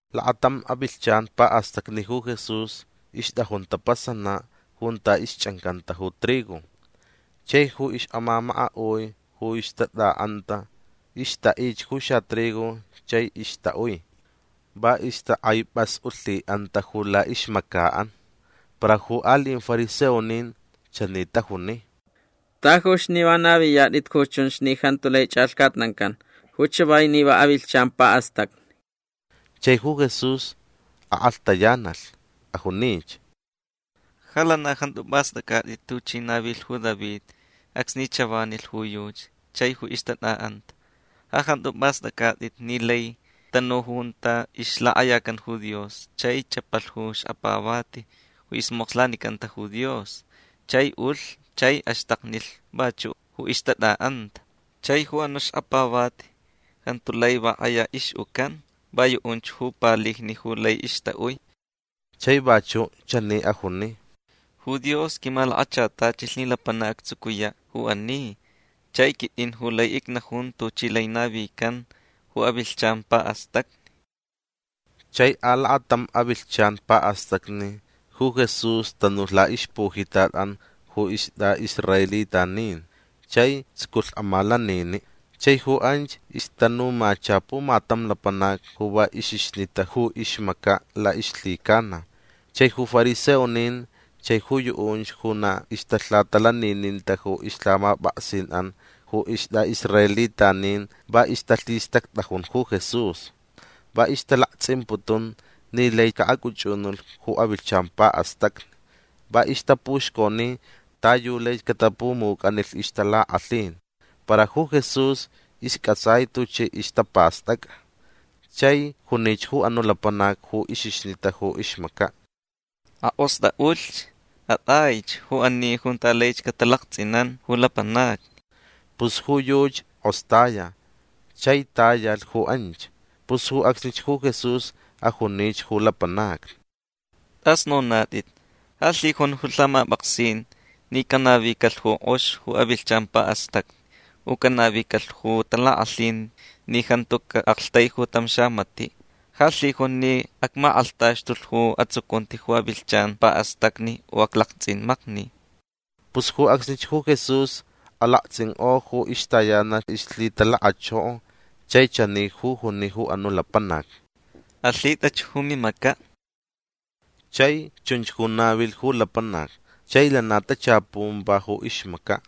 Lakatam avilhchan pa'astacni ju Jesús ixt'ajun tapasana' junta ixch'ancanta ju trigo. Chai ju ix'amamaka'ui ju ixtat'a'anta ixta'ich ju xatrigo chai ixta'ui. Va ixtak'aip'as'ulhi'anta ju la'ixmaca'an. Para ju ali'in fariseonin chani tajuni: ―Tajuch ni va naviyat'it ju chunch ni jantu lai ch'alhcatnancan ju chavai ni avilhchan pa'astacni. Chai ju Jesús ak'alhtayanalh. Ajunich: ―Ja lana jantu p'ast'ac'at'it tuchi navilh ju David acsni chavanilh ju yuchi chai ju ixtat'a'anta. Ja jantu p'ast'ac'at'it ni lai tanu junta ixlak'ayacan ju Dios chai ch'apalh ju xkapavati ju ismokslanicanta ju Dios. Chai ulh chai axtaknilh vachu' ju ixtat'a'anta. Chai ju anu' xkapavati jantu lai va k'aya ix'ucan. Va yu'unch ju palijni ju lai ixta'ui. Chai vachu' chani ajuni: ―Ju Dios quimalakachatachilh ni lapanac actsucuya' ju ani. Chai quit'in ju lai icnajun tuchi lai navican ju avilhchan pa'astacni. Chai alakatam avilhchan pa'astacni ju Jesús tanulh la'ixpujitat'an ju ist'a'israelitanin chai tsuculh amalanini'. Chai ju anch ixtanumacha pumatam lapanac ju va ixixnita ju ixmaca' la'ixlhicana. Chai ju fariseonin chai ju yu'unch ju na ixtalhatalanininta ju ixlhamap'aksin'an ju ist'a'israelitanin va ixtalhistact'ajun ju Jesús. Va ixtalakts'imputun ni lai ca'ac'uch'unulh ju avilhchan pa'astacni. Va ixtapuxconi ta yu laich catapumuc'anilh ixtalak'alhin. Para ju Jesús isc'atsai tuchi ixtapast'ac'a. Chai junich ju anu' lapanac ju ixixnita ju ixmaca': ―Ak'ost'a'ulh. At'aich ju ani junta laich catalakts'inan ju lapanacni. Pus ju yuchi k'ostaya chai tayalh ju anch. Pus ju acsnich ju Jesús ajunich ju lapanacni: ―T'as nonat'it. Ja lhijun ju lhamap'aksin ni canavicalh ju k'ox ju avilhchan pa'astacni u canavicalh ju talak'alhin ni jantu ca'aktaiju tam xamati'. Ja lhijun ni acmak'alhtaxtulh ju atsucunti ju avilhchan pa'astacni u aclakts'imakni. Pus ju acsnich ju Jesús alakts'ink'o ju ixtayanalh ixlhitalakachoko chai chani ju juni ju anu' lapanac: ―Alhit'ach ju mimaca'. Chai chunch ju navilh ju lapanac chai lana tachapun va ju ixmaca'.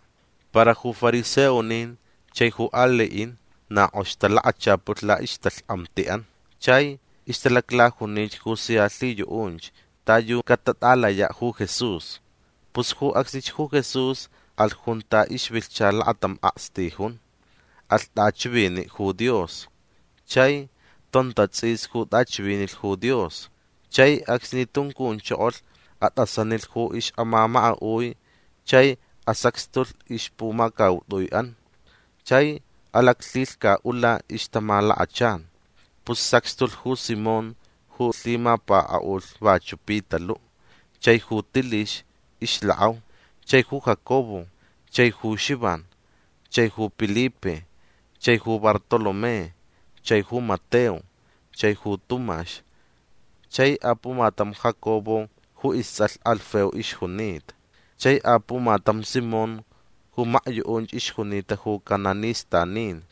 Para ju fariseonin chai ju ali'in na k'ox talakachapulh la'ixtalhk'amti'an. Chai ixtalaclajunich ju sia lhiyu'unch ta yu catat'alaya' ju Jesús. Pus ju acsnich ju Jesús alh junta ixvilhcha lakatam akstijun. Alh t'achivini' ju Dios. Chai tontats'is ju t'achivinilh ju Dios. Chai acsni tuncunchokolh at'asanilh ju ix'amamaka'ui chai asacxtulh ixpumacaut'ui'an. Chai alaclhilhca'ula ixtamalakachan. Pus sacxtulh ju Simón ju lhimapaka'ulh vachu' Pitalu' chai ju Tilix ixlak'au. Chai ju Jacobo. Chai ju Xivan. Chai ju Pilipe. Chai ju Bartolomé. Chai ju Mateo. Chai ju Tumax. Chai apumatam Jacobo ju ists'alh Alfeo ixjunita. Chai apumatam Simón ju makyu'unch ixjunita ju cananistanin.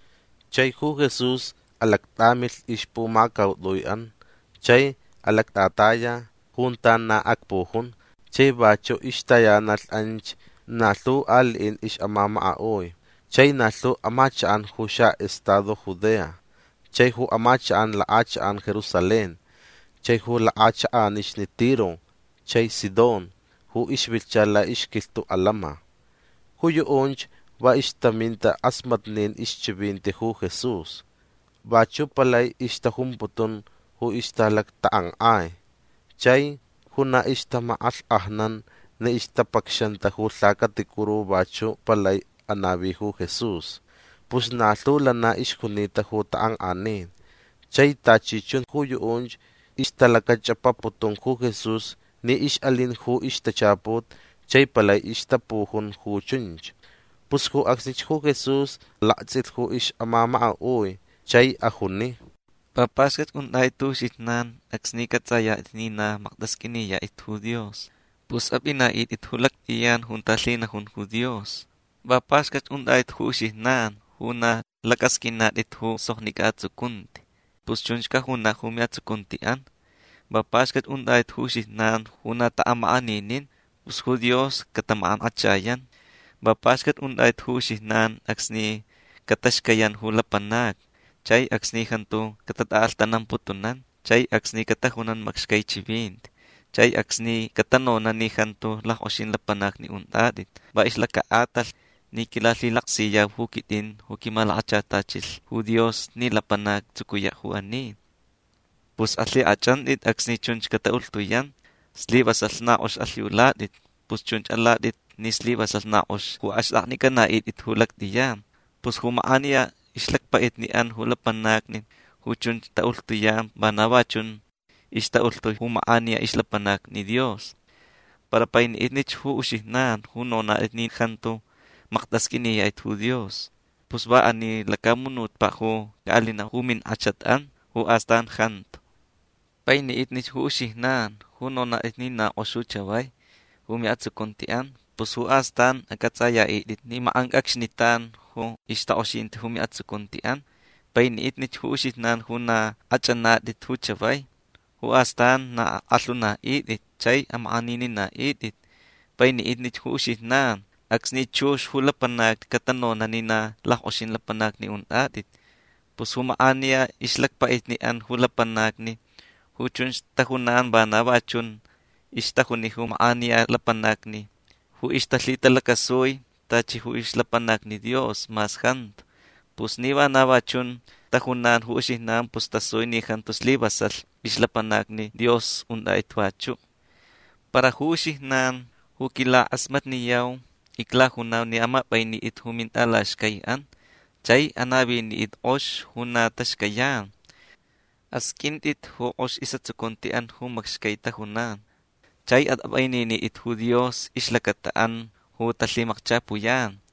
Chai ju Jesús alact'amilh ixpumacaut'ui'an chai alact'ataya junta na acpujun. Chai vachu' ixtayanalh anch na lhu ali'in ix'amamaka'ui chai na lhu amachak'an ju xa'estado Judea chai ju amachak'an lak'achak'an Jerusalén chai ju lak'achak'anixni Tiro chai Sidón ju ixvilhcha la'ixquilhtu' alama. Ju yu'unch va ixtaminta k'asmatnin ixchivinti ju Jesús. Vachu' palai ixtajumputun ju ixtalactak'ank'ai. Chai ju na ixtamak'alhk'ajnan ni ixtapacxanta ju lhacaticuru vachu' palai anavi ju Jesús. Pus na lhu lana ixjunita ju tak'ank'anin chai tachi chun ju yu'unch ixtalacach'apaputun ju Jesús ni ix'alin ju ixtachaput chai palai ixtapujun ju chunch. Pus ju acsnich ju Jesús lakts'ilh ju ix'amamaka'ui chai ajuni: ―Va paxcat unt'at'it ju uxijnan acsni c'ats'ayat'it ni na makt'asq'uiniyat'it ju Dios. Pus ap'ina'it'it ju lact'iyan junta lhinajun ju Dios. Va paxcat unt'at'it ju uxijnan ju na lac'asq'uinat'it ju soknic'a atsucunti. Pus chunch cajuna' ju mi'atsucunti'an. Va paxcat unt'at'it ju uxijnan ju na ta'amak'aninin. Pus ju Dios catamak'ank'achayan. Va paxcat unt'at'it ju uxijnan acsni cataxcayan ju lapanacni chai acsni jantu catat'a'alhtanamputunan chai acsni catajunan macxcai chivinti chai acsni catanona' ni jantu lack'oxin lapanacni unt'at'it va ixlaca'atalh ni quilalhilaksiyau ju quit'in ju quimalakachatachilh ju Dios ni lapanac actsucuya' ju ani. Pus alhik'ach'ant'it acsni chunch cata'ulhtuyan. Slivasalh na k'ox alhiulat'it. Pus chunch alat'it ni slivasalh na k'ox ju axt'aknic'ana'it'it ju lact'iyan. Pus ju mak'aniya ixlacpa'itni'an ju lapanacni ju chunch ta'ulhtuyan vana va chun ixta'ulhtui ju mak'aniya ixlapanacni Dios. Para paini'itnich ju uxijnan ju nonat'it ni jantu makt'asq'uiniyat'it ju Dios. Pus va ani lacamunutpa' ju ca'alina' ju mink'achat'an. Ju astan jantu. Paini'itnich ju uxijnan ju nonat'it ni na k'ox ju chavai ju mi'atsucunti'an. Pus ju astan ac'ats'aya'it'it ni mak'anc'acxnitan ju ixtak'oxinti ju mi'atsucunti'an. Paini'itnich ju uxijnan ju na k'ach'anat'it ju chavai. Ju astan na ak'alhuna'it'it chai amak'aninina'it'it. Paini'itnich ju uxijnan acsni chux ju lapanacni catanona' ni na lack'oxin lapanacni unt'at'it. Pus ju mak'aniya ixlacpa'itni'an ju lapanacni ju chunch tajunan vana va chun ixtajuni ju mak'aniya lapanacni ju ixtalhitalacasui tachi ju ixlapanacni Dios mas jantu. Pus ni vana va chun tajunan ju uxijnan pus tasui ni jantu slivasalh ixlapanacni Dios unt'at'it vachu'. Para ju uxijnan ju quilak'asmatniyau iclajunau ni amap'ainit'it ju mint'alaxcai'an. Chai anavinit'it k'ox ju na taxcayan. Asq'uint'it ju k'ox is'atsucunti'an ju macxcai tajunan. Chai at'ap'aininit'it ju Dios ixlacata'an ju talhimacchapuyan.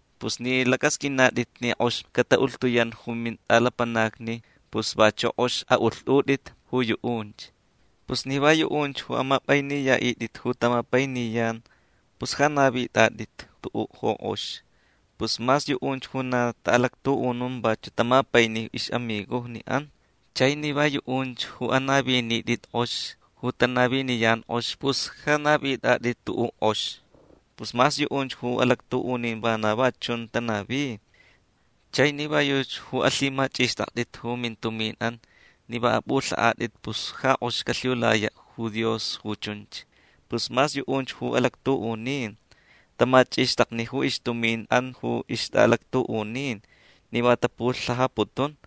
Pus ni lac'asq'uinat'it ni k'ox cata'ulhtuyan ju mint'alapanacni pus vachu' k'ox a'ulht'ut'it ju yu'unch. Pus ni va yu'unch ju amap'ainiya'it'it ju tamapainiyan pus ja navit'at'it tu'u' ju k'ox. Pus mas yu'unch ju na ta'alactu'unun vachu' tamapaini ix'amigojni'an. Chai ni va yu'unch ju anavinit'it k'ox ju tanaviniyan k'ox pus ja navit'at'it tu'u' k'ox. Pus mas yu'unch ju alactu'unin vana va chun tanavi. Chai ni va yuchi ju alhimach'ixt'akt'it ju mintumin'an ni va ap'ulha'at'it pus ja k'ox calhiulaya' ju Dios ju chunch. Pus mas yu'unch ju alactu'unin tamach'ixtakni ju ixtumin'an ju ixt'a'alactu'unin ni va tapulhajaputun.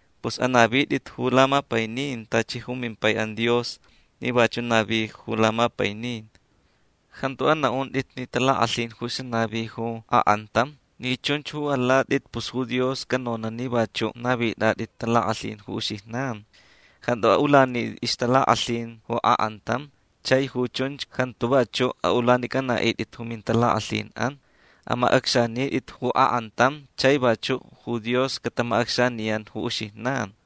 Pus anavit'it ju lamapainin tachi ju mimpai'an Dios ni vachu' navi ju lamapainin. Jantu ana'unt'it ni talak'alhin ju xanavi ju ak'antam. Ni chunch ju alat'it pus ju Dios canona' ni vachu' navit'at'it talak'alhin ju uxijnan. Jantu a'ulanit'it ixtalak'alhin ju ak'antam chai ju chunch jantu vachu' a'ulanic'ana'it'it ju mintalak'alhin'an. Amac'acxanit'it ju ak'antam chai vachu' ju Dios catamac'acxaniyan ju uxijnan.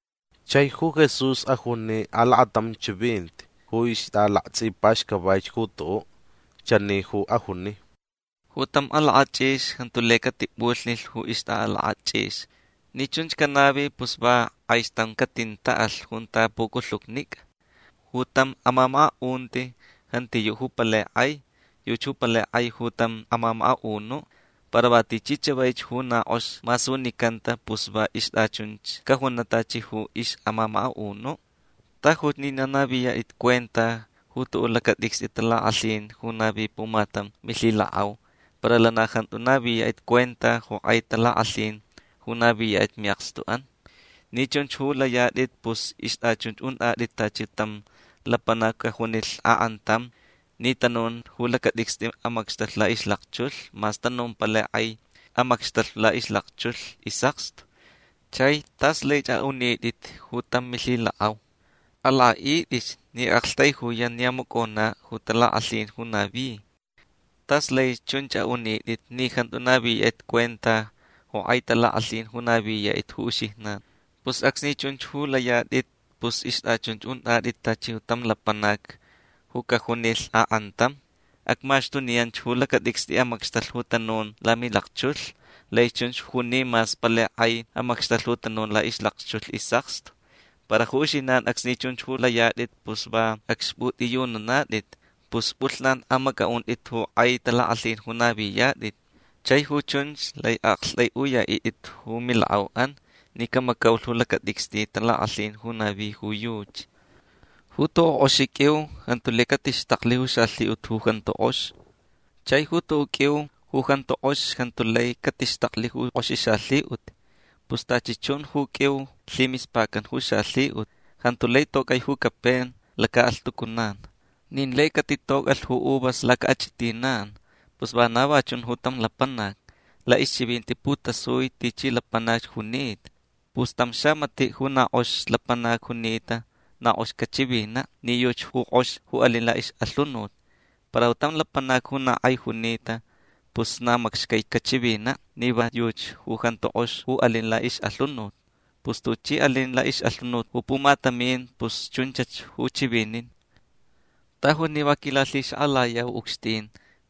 Chai ju Jesús ajuni alakatam chivinti ju ixt'alakts'ipaxcavaich ju tu'u'. Chani ju ajuni: ―Ju tam alak'ach'ix jantu lai catip'ulhni ju ixt'a'alak'ach'ix. Ni chunch canavi pus va k'aixtam catint'a'alh junta puculhucnic'a. Ju tam amamaka'unti jantiyu' ju palai k'ai. Yuchi ju palai k'ai ju tam amamaka'unu'. Para va tichi chavaich ju na k'ox masunicanta pus va ixt'achunchach cajuna' tachi ju ix'amamaka'unu'. Tajuch ni na naviyat'it cuenta ju tu'u' lacat'icst'i talak'alhin ju navi pumatam milhilak'au para lana jantu naviyat'it cuenta ju k'ai talak'alhin ju naviyat'it mi'akstu'an. Ni chunch ju layat'it pus ixt'achunch unt'at'it tachi tam lapanac ju cajunilh ak'antam ni tanun ju lacat'icst'i amacxtalh la'ixlakchulh mas tanun ju palai k'ai amacxtalh la'ixlakchulh is'akstu. Chai tas laich a'unit'it ju tam milhilak'au: “Alak'a'it'ich ni ac'aktaijuyan ni amacona' ju talak'alhin ju navi”. Tas laich chunch a'unit'it ni jantu naviyat'it cuenta ju k'ai talak'alhin ju naviyat'it ju uxijnan. Pus acsni chunch ju layat'it pus ixt'achunch unt'at'it tachi tam lapanac ju cajunilh ak'antam: “Acmaxtuniyanch ju lacat'icst'i amacxtalh ju tanun lamilakchulh”. Laich chunch juni mas palai k'ai amacxtalh ju tanun la'ixlakchulh is'akstu. Para ju uxijnan acsni chunch ju layat'it pus va acxp'ut'iyununat'it. Pus p'ulhnan amac'a'unt'it ju k'ai talak'alhin ju naviyat'it. Chai ju chunch lai a'akt'ai'uya'it'it ju milak'au'an ni camacaulh ju lacat'icst'i talak'alhin ju navi ju yuchi. Ju tu'u' k'oxi q'uiu jantu lai catixtaklh ju xalhi'ut ju jantu k'ox. Chai ju tu'u' q'uiu ju jantu k'ox jantu lai catixtaklh ju k'oxi xalhi'ut. Pus tachi chun ju q'uiu lhimispacan ju xalhi'ut. Jantu lai toc'ai ju capen laca'alhtucunan. Nin lai catitoc'alh ju uvas laca'ach'itinan. Pus vana va chun tam lapanac. La'ixchivinti putasui tichi lapanac junita. Pus tam xamati' ju na k'ox lapanac junita na k'ox cachivina' ni yuchi ju k'ox ju alin la'ix'alhunut. Para tam lapanac ju na k'ai junita pus na macxcai cachivina' ni va yuchi ju jantu k'ox ju alin la'ix'alhunut. Pus tuchi alin la'ix'alhunut ju pumatamin pus chunchach ju chivinin. Tajuch ni va quilalhixak'alayau ucxtin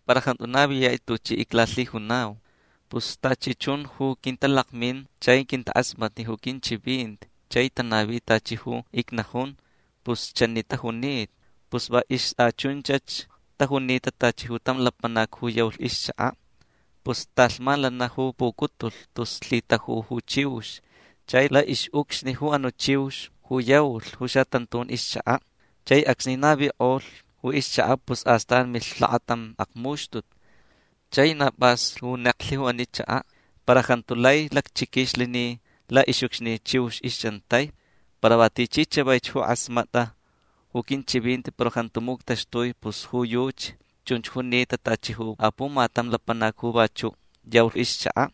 para jantu naviyat'it tuchi iclalhijunau. Pus tachi chun ju quintalakmin chai quintak'asmatni ju quinchivinti chai tanavi tachi ju icnajun pus chani tajunita. Pus va ixt'achunchach tajunita tachi ju tam lapanac ju yaulh ixchaka'. Pus talhman lana ju pucutulh tus lhitajulh ju chiux chai la'ix'ucxni ju anu' chiux ju yaulh ju xatantun ixchaka'. Chai acsni navik'olh ju ixchaka' pus astan milh lakatam akmuxtut. Chai na p'as ju neklh ju ani chaka'. Para jantu lai lacchiquixlh ni la'ix'ucxni chiux ixch'antai. Para va tichi chavaich ju k'asmat'a ju quinchivinti para jantu muctaxtui pus ju yuchi chunch junita tachi ju apumatam lapanac ju vachu' yaulh ixchaka'.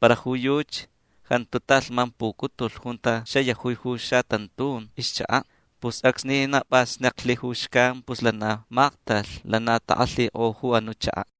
Para ju yuchi jantu talhman pucutulh junta xayajui ju xatantun ixchaka'. Pus acsni na p'as neklh ju xcan pus lana maktalh. Lana tak'alhik'o ju anu' chaka'.